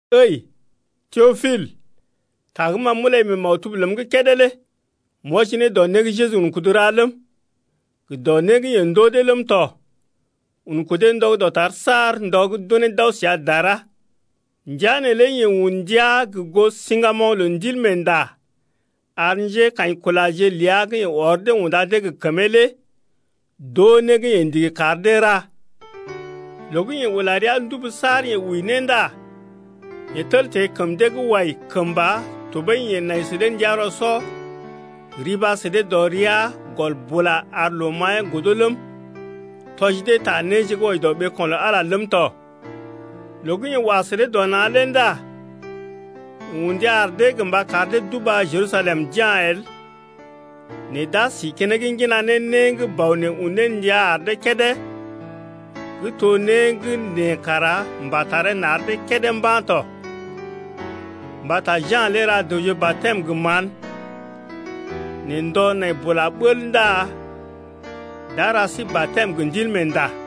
Ǝi, Teopil, ta gə́ ma m’ulai mee maktub ləm gə́ kédé lé m’wɔji ne dɔ né gə́ Jeju un kudu ra ləm, gə dɔ né gə́ yeḛ ndoo dee ləm tɔ un kudee ndɔ gə́ dɔtar saar ndɔ gə́ d’unee d’aw ne səa dara. Ndəa neelé yeḛ un ndia gə goo siŋgamoŋ lə Ndilmeenda ar njékaḭkulaje ləa gə́ yeḛ ɔr dee unda dee gə kəmee lé d’oo né gə́ yeḛ ndigi kar dee ra. Loo gə́ yeḛ ula rəa ndubu saar yeḛ wəi ne ndá yeḛ tel teḛ kəm dee’g wai kəmba tɔɓəi yeḛ nai sə dee ndəa rɔ-sɔ riba sə dee dɔ rəa’g gɔl bula ar loo maḭyee godo ləm, tɔji dee ta néje gə́ wɔji dɔ ɓeeko̰ lə Ala lé ləm tɔ. Loo gə́ yeḛ wa sə dee dɔ na̰ lé ndá yeḛ un ndia ar dee gə mba kar dee d’uba Jerusalem d’ya̰ el nɛ d’a si keneŋ ŋgina ne né gə́ Bɔ neḛ un ne ndia ar dee kédé gə́ to né gə́ neḛ kara m’pa taree n’ar dee kédé mba̰ lé to: mbata Ja̰ lé ra dəwje batɛm gə mán nɛ ndɔ nai bula bəl ndá d’a ra sí batɛm gə Ndilmeenda ya.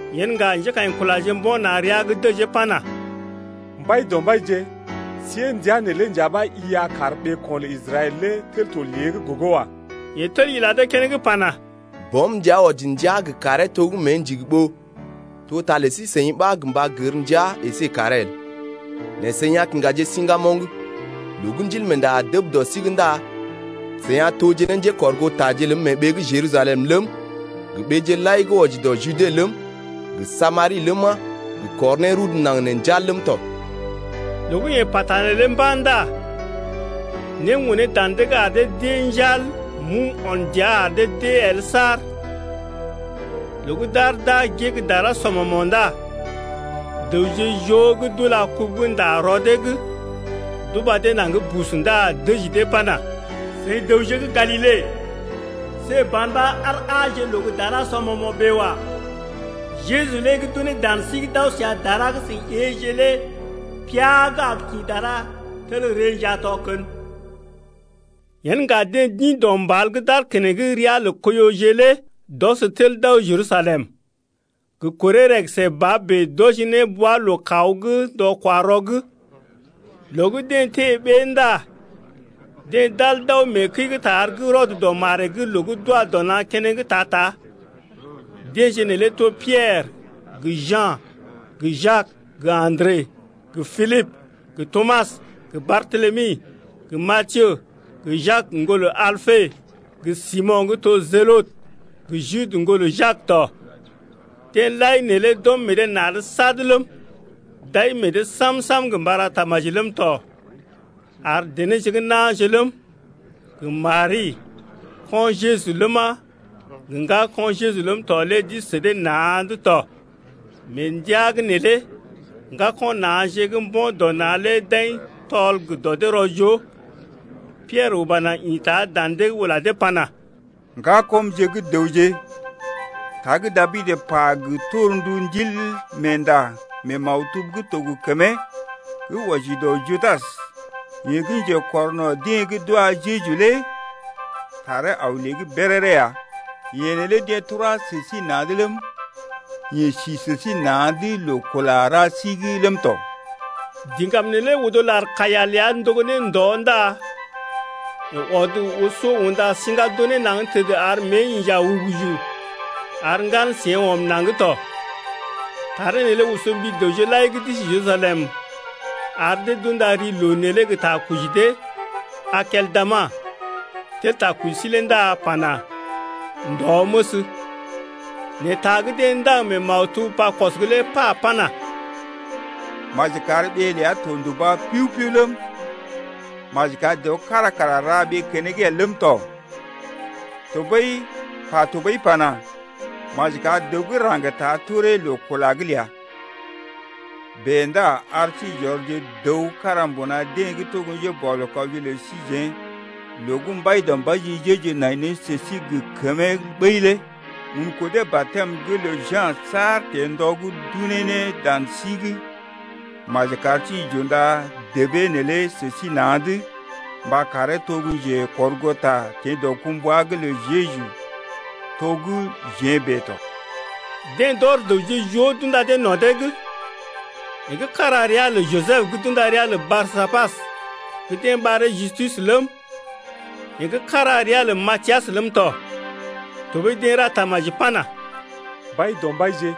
Yen ŋga njékaḭkulaje mbo̰ na̰ rəa’g dəjee pana: Mbaidɔmbaije, see ndəa neelé nja ɓa i a kar ɓeeko̰ lə Israɛl lé tel to lée’g gogo wa. Yeḛ tel ila dee keneŋ pana: Bɔm nja wɔji ndəa gə kàree to gə́ mée ndigi ɓó to ta lə sí-seḭ ɓa gə mba gər ndəa əsé kàree el. Nɛ seḭ a kiŋgaje siŋgamoŋ loo gə́ Ndilmeenda a dəb dɔ sí’g ndá seḭ a toje ne njékɔrgootaje ləm mee ɓee gə́ Jerusalem ləm, gə ɓeeje lai gə́ wɔji dɔ Jude ləm, gə Samari ləma, gə kɔr ne rudu naŋg nee njal ləm tɔ. Loo gə́ yeḛ pata neelé mba̰ ndá né unee dan dee’g ar dee d’ée njal mum on dəa ar dee d’ée el saar. Loo gə́ d’aar d’aa gée gə́ dara sɔmɔmo̰ ndá dəwje joo gə́ d’ula kubu gə́ nda rɔ dee’g d’uba dee naŋg bus ndá dəji dee pana: Seḭ dəwje gə́ Galile, see ban ɓa aar aaje loo gə́ dara sɔmɔmo̰ bèe wa. Jeju lé gə́ d’unee dan sí’g d’aw səa dara gə́ seḭ éeje lé pia gə́ a gə kḭ dara tel ree nja to kən. Yen ŋga deḛ d’ḭ dɔ mbal gə́ d’aar keneŋ ria lə Koiyoje lé d’ɔs tel d’aw Jerusalem, gə kuree rəgəsə ba bèe d’wɔji ne boa-loo-kaw gə́ ndɔ-kwa-rɔ’g. Loo gə́ deḛ teḛ ɓée ndá deḛ d’al d’aw mee kəi gə́ tar gə́ rɔd dɔ maree’g loo gə́ d’wa dɔ na̰ keneŋ ta-ta, deḛje neelé to Piɛrə, gə Ja̰, gə Jak, gə Andre, gə Pilibə, gə Tomas, gə Bartelemi, gə Matiyo, gə Jak ŋgolə Alpe, gə Simo̰ gə́ to Jelotə, gə Jude ŋgolə Jak tɔ. Deḛ lai neelé d’ɔm meḛ dee na̰’d sad ləm, d’ai meḛ dee sam-sam gə mba ra tamaji ləm tɔ ar denéje gə́ na̰je ləm, gə Mari, ko̰ Jejuje ləma, gə ŋgako̰ Jejuje ləm tɔ lé d’isi sə dee na̰’d tɔ. Mee ndəa’g neelé ŋgako̰ na̰je gə́ mbo̰ dɔ na̰ lé d’aḭ tɔl gə dɔ dee rɔ-joo. Piɛrə uba naŋg ḭta dan dee’g ula dee pana: Ŋgakɔmje gə́ dəwje, ta gə́ Dabid pa gə torndu Ndilmeenda mee maktub gə́ to gə kəmee gə́ wɔji dɔ Judas, yeḛ gə́ njekɔrno̰ deḛ gə́ d’wa Jeju lé taree aw lée’g béréré ya. Yeḛ neelé deḛ turá sə sí na̰’d ləm, yeḛ si sə sí na̰’d loo kula ra sí’g ləm tɔ. (Diŋgam neelé odo lar-kaiya ləa ndogo ne ndɔ ndá yeḛ ɔd oso unda siŋga dunee naŋg təd ar mée inja wuguju ar ŋgan siḭyee ɔm naŋg tɔ. Taree neelé oso mbi dəwje lai gə́ d’isi Jerusalem ar dee d’unda ri loo neelé gə ta koji dee Hakeldama, tel ta koji sí lé ndá pana: Ndɔ məs.) Nɛ ta gə́ deḛ ndaŋg mee maktub Pakɔs’g lé pa pana: Maji kar ɓee ləa to nduba piu-piu ləm, Maji kar dəw kára kara ra ɓee keneŋ el ləm tɔ. Tɔɓəi pa tɔɓəi pana: Maji kar dəw gə́ raŋg taa toree loo-kula’g ləa. Bèe ndá ar sí j’ɔrje dəw kára mbuna deḛ gə́ to njéboalookawje lə síjeḛ loo gə́ Mbaidɔmbaije Jeju nai ne sə sí gə kəmee ɓəi lé un kudee batɛm’g lə Ja̰ saar teḛ ne ndɔ gə́ d’unee ne dan sí’g, maji kar sí j’undá debee neelé sə sí na̰’d mba karee to njekɔrgoota teḛ dɔkumbwa’g lə Jeju to gə́ jeḛ bèe tɔ. Deḛ d’ɔr dəwje joo d’unda dee no̰ dee’g, yeḛ gə́ kára ria lə Jisəb gə́ d’unda ria lə Barsabas gə́ deḛ ɓaree Justus ləm, yeḛ gə́ kára ria lə Matias ləm tɔ. Tɔɓəi deḛ ra tamaji pana: Mbaidɔmbaije,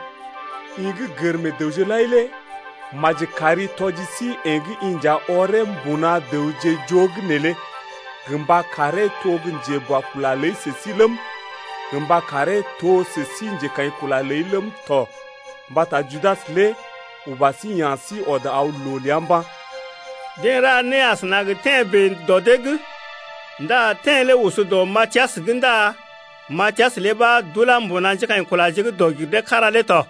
i gə́ gər meḛ dəwje lai lé maji kari tɔji sí yeḛ gə́ i nja ɔree mbuna dəwje joo’g neelé gə mba karee to gə́ njeboakula ləi sə sí ləm, gə mba karee to sə sí njekaḭkula ləi ləm tɔ mbata Judas lé uba sí ya̰ sí ɔd aw loo ləa mba̰. Deḛ ra né asəna gə téen bèe dɔ dee’g ndá téen lé oso dɔ Matias’g ndá Matias lé ɓa d’ulá mbuna njékaḭkulaje gə́ dɔg-gir-dee-kára’g lé tɔ.